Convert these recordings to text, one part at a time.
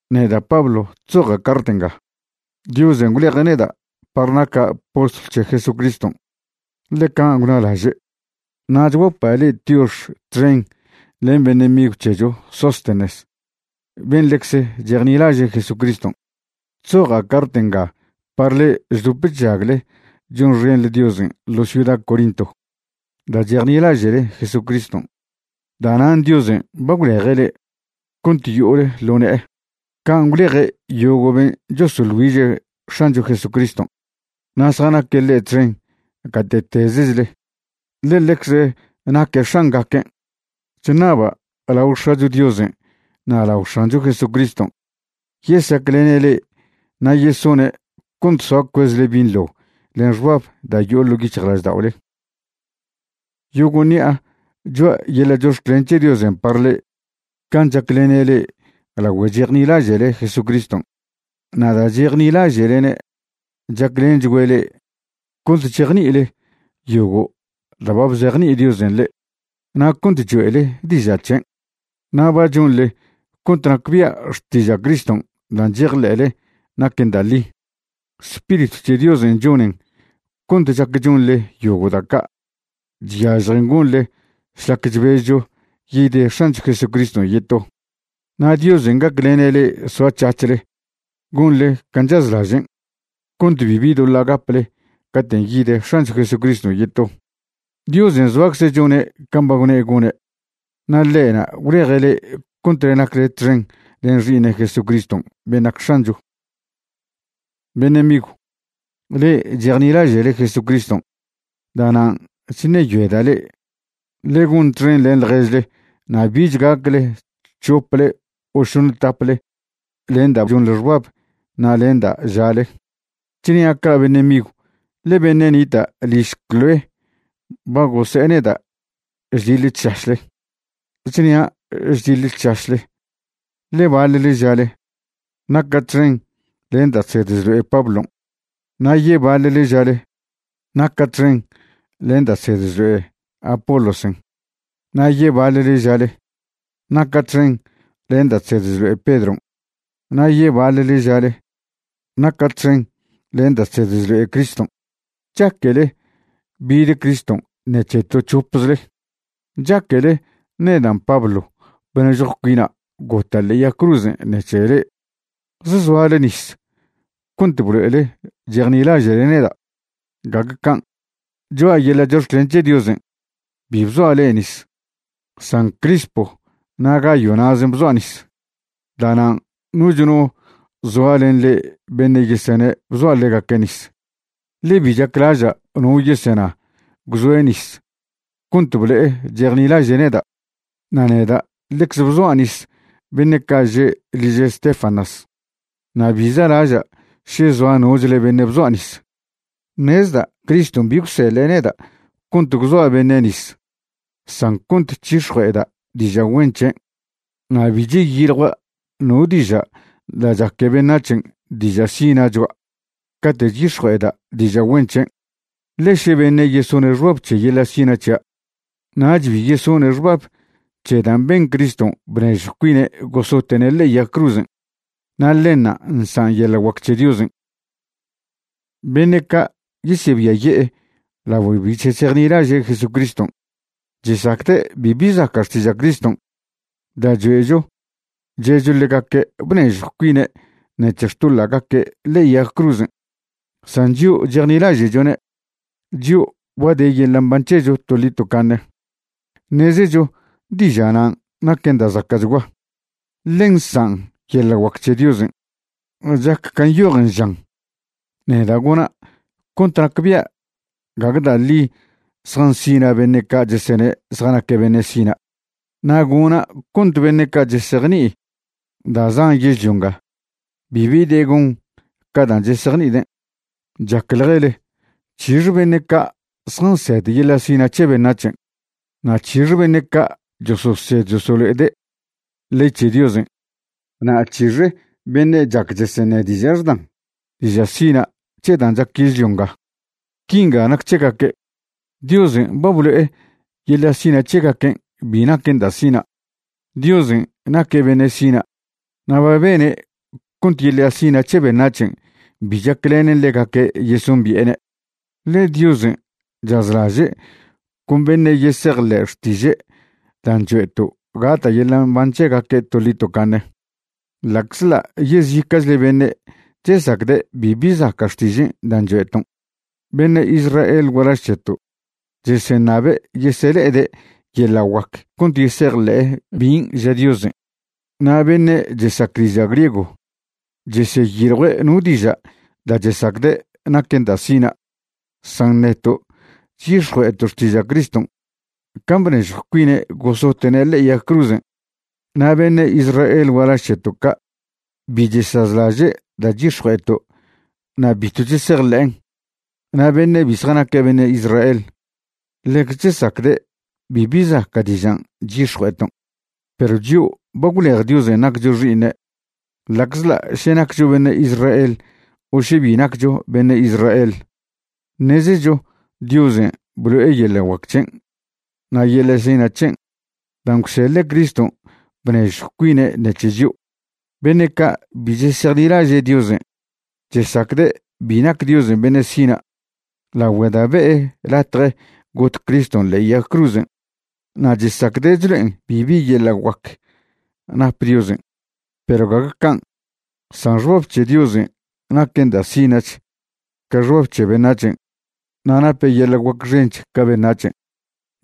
Neda' Pablo chzoja' cart nga. Diosen' gwleje' neda' par naca' postlw c̱he Jesucriston', ḻe can' gwnalaže'. Na' chguapa' le'e tiox txen len beṉe' migw c̱hecho Sóstenes ben' ḻecze chejnilaže' Jesucriston'. Chzoja' cart nga par le'e chdop chžagle chonxenḻe Diosen' ḻo ciuda Corinto. Da' chejnilaže'le Jesucriston', da'nan' Diosen' ba gwleje' le'e cont yo'ole ḻo ne'e, can' gwleje' yogo' ben' chosoḻ güiže' X̱ancho Jesucriston' na' zjanaque' ḻe' txen gate'tezechle, ḻe ḻecze naque' X̱angaquen'. Chṉaba' lao X̱acho Diosen' na' lao X̱ancho Jesucriston' yesaclene' le'e na' yesone' cont soa cuezle binḻo len xbab da' yo'o ḻo' yic̱hjlažda'ole. Yogo' ṉi'a choa' yeḻa' chox̱clen c̱he Diosen' par le'e can' chaclene' le'e lagüe chejnilaže'le Jesucriston'. Na' da' chejnilaže'lene' chaclenchgüe' le'e cont chejni'ile yogo' da' ba bzejni'i Diosen' le'e na' cont choe'le diža' c̱hen. Na' ba chonḻe cont nacbia' xtiža' Criston' da' chejḻe'le naquen da' ḻi. Spiritw c̱he Diosen' chonen cont chac chonḻe yogo' da' ca' chyažjen gonḻe šlac chbezcho yid X̱ancho Jesucriston' yeto. Na' Diosen' gaclene' le'e soac̱hac̱hle gonḻe can' chazlažen' cont bibi doḻa' gaple caten' yid X̱ancho Jesucriston' yeto. Diosen' zoacze' chone' can' ba gwne' gone', na' ḻe'na' gwleje' le'e cont nacle txen len Xi'iṉe' Jesucriston' ben' nac X̱ancho. Beṉe' migw, le'e chejnilaže'le Jesucriston'. Da'nan' chṉeyoeda' le'e, ḻe gon txen len ḻježle na' bich gacle c̱hople o šoṉ taple len da' chonḻe xbab na' len da' žale. Chnia' ca' beṉe' migw, ḻe beṉe' nita' liž Cloé ba gose'e neda' chdiḻe chšašle. Chnia' chdiḻe chšašle, ḻe baḻle žale: “Naca' txen len da' chsed chlo'e Pablon'.” Na' yebaḻle žale: “Naca' txen len da' chsed chlo'e Apolosen'.” Na' yebaḻle žale: “Naca' txen len da' chsed chlo'e Pedron'.” Na' yebaḻle žale: “Naca' txen len da' chsed chlo'e Criston'.” ¿Chaquele bid Criston' ṉec̱he to c̱hopzle? ¿Chaquele nedan' Pablo bnežjw cuina' gota' ḻe'e yag cruz ṉec̱he le'e? ¿Zsoale nis cont blo'ele chejnilaže'le neda'? Gague can'. Choa' yeḻa' chox̱clen c̱he Diosen' bi bzoa' le'e nis, san Crispo na' Gayo na'zen' bzoa' nis. Da'nan' noch no zoa len le'e beṉe' yesene' bzoa' ḻegaque' nis, ḻe bi chaclaža' no yesena gwzoe' nis cont blo'e chejnilaže' neda'. Na' neda' ḻecze bzoa' nis beṉe' ca' že' liž Estéfanas, na' bi za'laža' še zoa nochle beṉe' bzoa' nis. Ṉezda' Criston' bi gwseḻe' neda' cont gwzoa' beṉe' nis san cont c̱hix̱jue'eda' diža' güen c̱hen'. Na' bi cheyiljua' no diža' da' chaque beṉac̱hen' diža' sina' choa' cate' chyix̱jue'eda' diža' güen c̱hen', ḻe še beṉe' yesone' xbab c̱he yeḻa' sina' c̱hia', nach bi yesone' xbab c̱he dan' ben Criston' bnežjw cuine' gosote'ne' ḻe'e yag cruzen', na' ḻenṉa' nsan' yeḻa' guac c̱he Diosen'. Beṉe' ca' yesebiaye'e lagüe bi chesejnilaže' Jesucriston', chesacde' bibi zaca' xtiža' Criston' da' choe'cho che'cho ḻegaque' bnežjw cuine' ṉec̱he xtoḻa'gaque' ḻe'e yag cruzen'. San chio' chejnilaže'chone', chio' ba de yeḻa' mban c̱hecho toḻi tocaṉe, ṉezecho diža' nan' naquen da' zaca'chgua, ḻe nsan' yeḻa' guac c̱he Diosen'. Chac can' nyojen žan: Neda' gona' cont nacbia' gague da' ḻi zjansina' beṉe' ca' chesene' zjanaque' beṉe' sina'. Na' gona' cont beṉe' ca' chesejni'i da' zan yežlio nga, bibi de gon ca dan' chesejni'ide'. Chacḻjele ¿c̱hixe beṉe' ca' zjansed yeḻa' sina' c̱he beṉac̱hen'? na' ¿c̱hixe beṉe' chososed chosolo'ede' ley c̱he Diosen'? na' ¿c̱hixe beṉe' chac cheseṉe' diža' xdan diža' sina' c̱he dan' chac yežlio nga? Quinga nac c̱hegaque', Diosen' ba blo'e yeḻa' sina' c̱hegaquen' bi naquen da' sina'. Diosen' naque' beṉe' sina' na' ba bene' cont yeḻa' sina' c̱he beṉac̱hen' bi chaclenen ḻegaque' yesombi'ene'. Ḻe Diosen' chazlaže' con beṉe' yesejḻe' xtiže' dan' choe'to' gata' yeḻa' mban c̱hegaque' toḻi tocaṉe, ḻa'czḻa' yezica'chle beṉe' chesacde' bibi zaca' xtižen' dan' choe'ton'. Beṉe' Israel gualaž c̱heto' cheseṉabe' yesele'ede' yeḻa' guac cont yesejḻe'e bin' ža Diosen', na' beṉe' chesac diža' griego cheseyiljue' no diža' da' chesacde' naquen da' sina'. San neto' chyix̱jue'eto' xtiža' Criston' can' bnežjw cuine' gosote'ne' ḻe'e yag cruzen'. Na' beṉe' Israel gualaž c̱heto' ca' bi chesazlaže' da' chyix̱jue'eto' na' bitw chesejḻe'en. Na' beṉe' bi zjanaque' beṉe' Israel ḻecze chesacde' bibi zaca' dižan' chyix̱jue'eton'. Perw chio' ba gwlej Diosen' naccho xi'iṉe', ḻa'aczḻa' še naccho beṉe' Israel o še bi naccho beṉe' Israel, ṉezecho Diosen' blo'e yeḻa' guac c̱hen' na' yeḻa' sina' c̱hen' dan' gwseḻe' Criston' bnežjw cuine' ṉec̱he chio'. Beṉe' ca' bi chesejnilaže' Diosen' chesacde' bi nac Diosen' beṉe' sina' lagüe da' be'e latje got Criston' ḻe'e yag cruzen', na' chesacde' chlo'en bibi yeḻa' guac nap Diosen'. Perw gague can', san xbab c̱he Diosen' naquen da' sina'ch ca xbab c̱he beṉac̱hen', na' nape' yeḻa' guac xench ca beṉac̱hen'.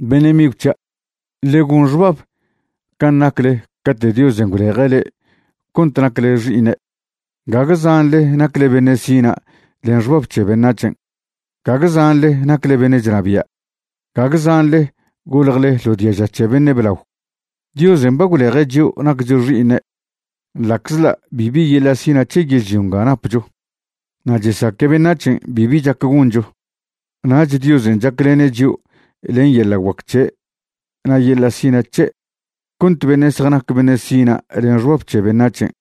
Beṉe' migw c̱hia', ḻe gon xbab can' nacle cate' Diosen' gwleje' le'e cont nacle xi'iṉe'. Gague zanḻe nacle beṉe' sina' len xbab c̱he beṉac̱hen', gague zanḻe nacle beṉe' chnabia', gague zanḻe goljle ḻo diaža c̱he beṉe' blao. Diosen' ba gwleje' chio' naccho xi'iṉe' ḻa'czḻa' bibi yeḻa' sina' c̱he yežlio nga napcho, na' chesaque beṉac̱hen' bibi chac goncho; nach Diosen' chaclene' chio' len yeḻa' guac c̱he' na' yeḻa' sina' c̱he' cont beṉe' zjanac beṉe' sina' len xbab c̱he beṉac̱hen'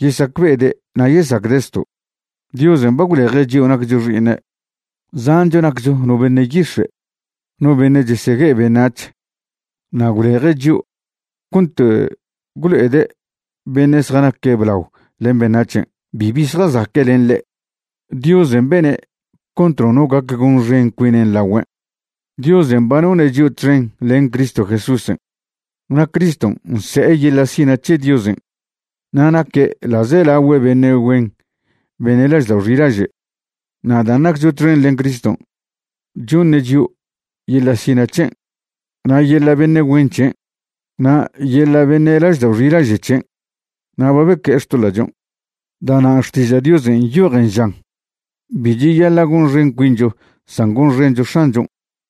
yesacbe'ede' na' yesacde' zto'. Diosen' ba gwleje' chio' naccho xi'iṉe', zancho naccho no beṉe' yix̱e', no beṉe' chesegue'e beṉac̱h, na' gwleje' chio' cont gwlo'ede' beṉe' zjanaque' blao len beṉac̱hen' bibi zjazaque' len ḻe'. Diosen' bene' cont nono gac gonxen cuine' lagüen'. Diosen' ba none' chio' txen len Cristo Jesúsen', na' Criston' nse'e yeḻa' sina' c̱he Diosen' na' naque' ḻa'zelagüe beṉe' güen beṉe' laždao' xilaže'. Na' dan' naccho txen len Criston', choṉe' chio' yeḻa' sina' c̱hen', na' yeḻa' beṉe' güen chen', na' yeḻa' beṉe' laždao' xilaže' c̱hen', na' ba beque'e xtoḻa'chon'. Da'nan' Xtiža' Diosen' nyojen žan: “Bi cheyaḻa' gonxen cuincho san gonxencho X̱anchon'.”